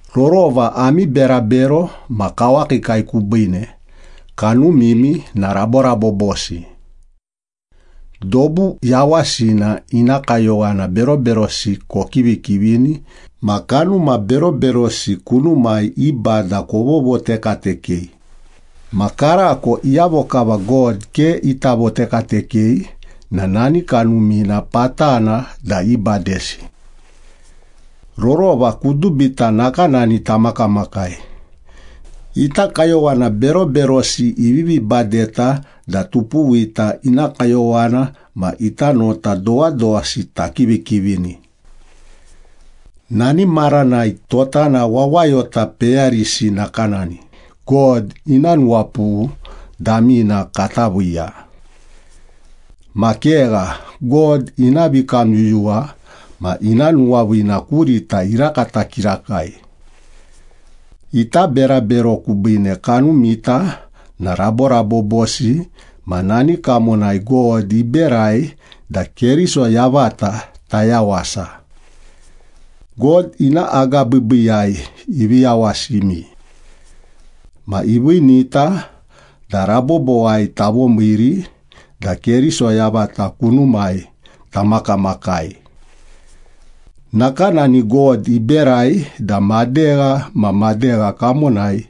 Rorova ami berabero ma kawakiikai kubiine, kanumimi na raborabobosi. Dobu yawasina ina kayowana beroberosi kokivikivini ma kanuma beroberosi kunumai i bada kovovotekatekei, ma karako iyavo kava God ke ita vovotekatekei na nani kanumina patana da ibadesi. Rorova kudubita nakanani tamakamakai, ita kayowana beroberosi ivivi badeta da tupuwita ina kayowana ma ita nota dowadowasi takivikivini. Nani maranai tota na wawayota peyarisi nakanani, God ina nuwapughu damina kata viiya. Ma kegha, God ina vikamyuyuwa ma ina nuwaviina kurita irakata kirakai. Ita berabero kubiine kanumita na raborabobosi ma nani kamonai God iberai da Keriso yavata tayawasa. God ina agabiibiiyai ivi yawasimi. Ma iviinita da rabobowai tavomiiri da Keriso yavata kunumai tamakamakai. Nakanani God iberai da madegha ma madegha kamonai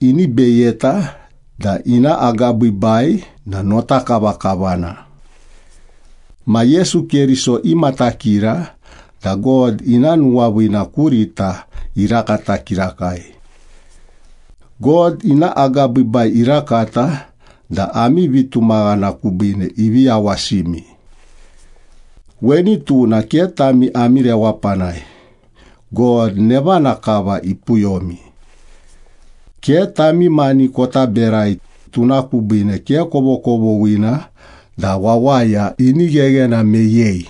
ini beyeta da ina agabiibai na notakavakavana. Ma Yesu Keriso imatakira da God ina nuwaviina kurita irakata kirakai. God ina agabiibai irakata da ami vitumaghana kubiine ivi yawasimi. Weni tuna ke tami ami rewapanai, God nevana kava ipuyomi. Ke tami mani kota berai, tuna kubiine ke kovokovoghina da wawaya ini gheghena meyei.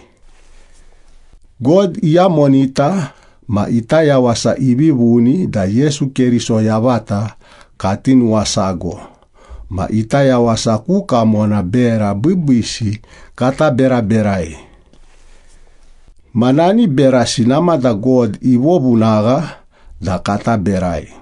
God iyamonita ma ita yawasa ivi vuni da Yesu Keriso yavata kati nuwasago ma ita yawasa ku kamona bera biibiisi kata beraberai. Ma nani berasi namada God ivovunagha da kata berai.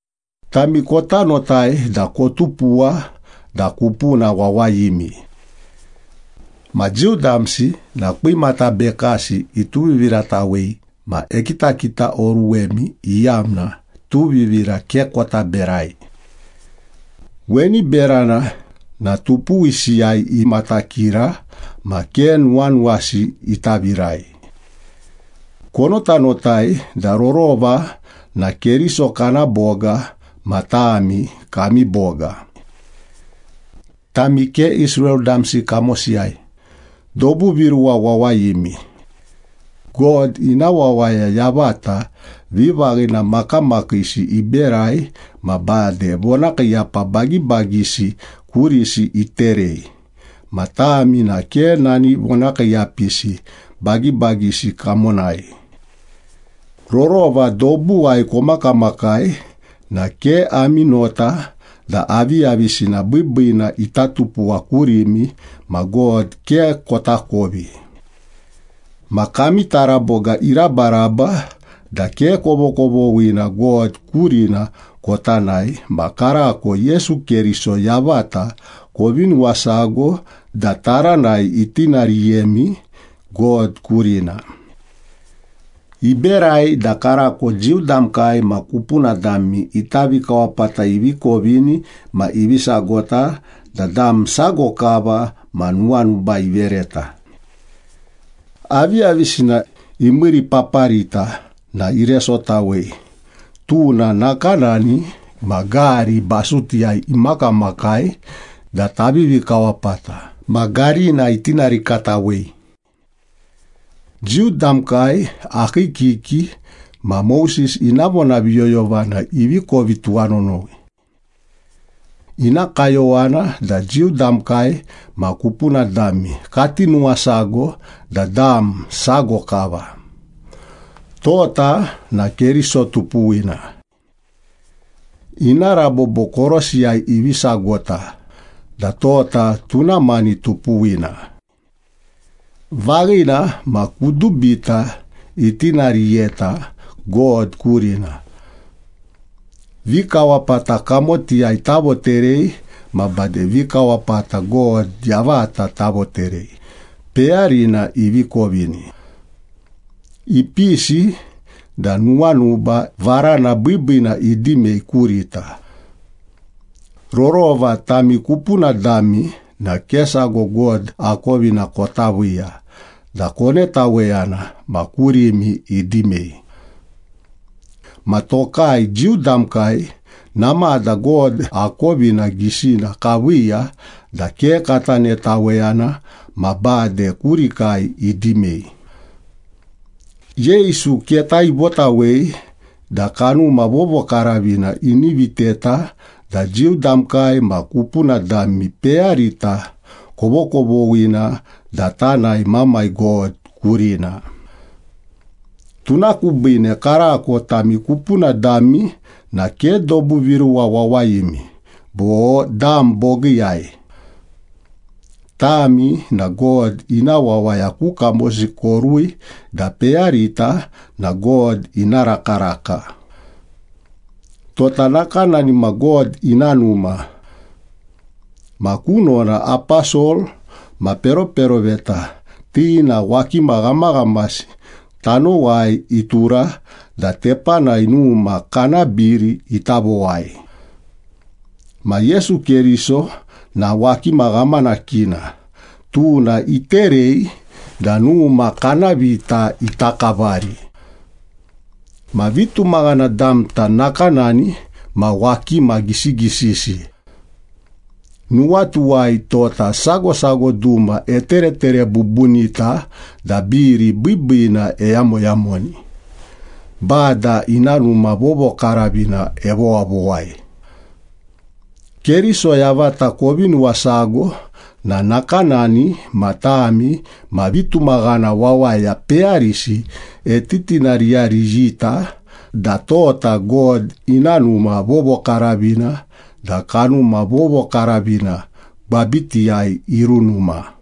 Tami kota notai da kotupuwa da kupuna wawayimi. Ma Jiu damsi na kwimata bekasi ituviviratawei ma ekitakitaoruwemi iyamna tuvivira ke kota berai. Weni berana na tupuwisiyai imatakira ma ke nuwanuwasi ita virai. Konotanotai da rorova na Keriso kana boga ma tami kami boga. Tami ke Israel damsi kamosiyai, dobu viruwa wawayimi. God ina wawaya yavata vivaghina makamakiisi iberai ma bade vonakiiyapa bagibagisi kurisi iterei ma tami na ke nani vonakiiyapisi bagibagisi kamonai. Rorova dobuwai komakamakai na ke ami nota da aviyavisina biibiina ita tupuwa kurimi ma God ke kotakovi. Ma kami taraboga irabaraba da ke kovokovoghina God kurina kota nae ma karako Yesu Keriso yavata kovi nuwasago da taranai itinariyemi God kurina. Iberai da karako Jiu damkai ma kupuna dami ita vikawapata ivi kovini ma ivi sagota da dam sago kava ma nuwanuba ivereta. Aviyavisina imiiripaparita na iresotawei, tuna nakanani ma gari basutiyai imakamakai da tavivi kawapata ma garina itinarikatawei. Jiu damkai akii kiki ma Moses ina vonaviyoyovana ivi kovi tuwanonowi. Ina kayowana da Jiu damkai ma kupuna dami kati nuwasago da dam sago kava, tota na Keriso tupuwina. Ina rabobo korosiyai ivi sagota da tota tuna mani tupuwina. Vaghina ma kudubita itinariyeta God kurina. Vikawapata kamotiyai tavoterei ma bade vikawapata God yavata tavoterei, peyarina ivi kovini. Ipisi da nuwanuba varana biibiina idimei kurita. Rorova tami kupuna dami na ke sago God akovina kota viiya da konetaweyana ma kurimi idimei. Ma tokai Jiu damkai namada God akovina gisina kaviiya da ke kata netaweyana ma bade kurikai idimei. Yesu keta ivotawei da Kanuma Vovokaravina ini viteta da Jiu damkai ma kupuna dami peyarita kovokovoghina da tanae Mamai God kurina. Tuna kubiine karako tami kupuna dami na ke dobu viruwa wawayimi, bo dam bogiiyai. Tami na God ina wawaya ku kamosi korui da peyarita na God ina rakaraka. Tota nakanani ma God ina numa. Ma kunona aposol ma peroperoveta ti na wakima ghamaghamasi tanowai itura da tepanai numa kana biri ita vowai. Ma Yesu Keriso na wakima ghamanakina, tuna iterei da numa kana vita ita kavari. Ma vitumaghana damta nakanani ma wakima gisigisisi. Nuwatuwai tota sago sago duma eteretere bubunita da biri biibiina eyamoyamoni, Bada ina numa vovokaravina evowavowai. Keriso yavata kovi nuwasago na nakanani ma tami ma vitumaghana wawaya peyarisi etitinariyariyita da tota God ina numa vovokaravina da Kanuma Vovokaravina gwabitiyai irunuma.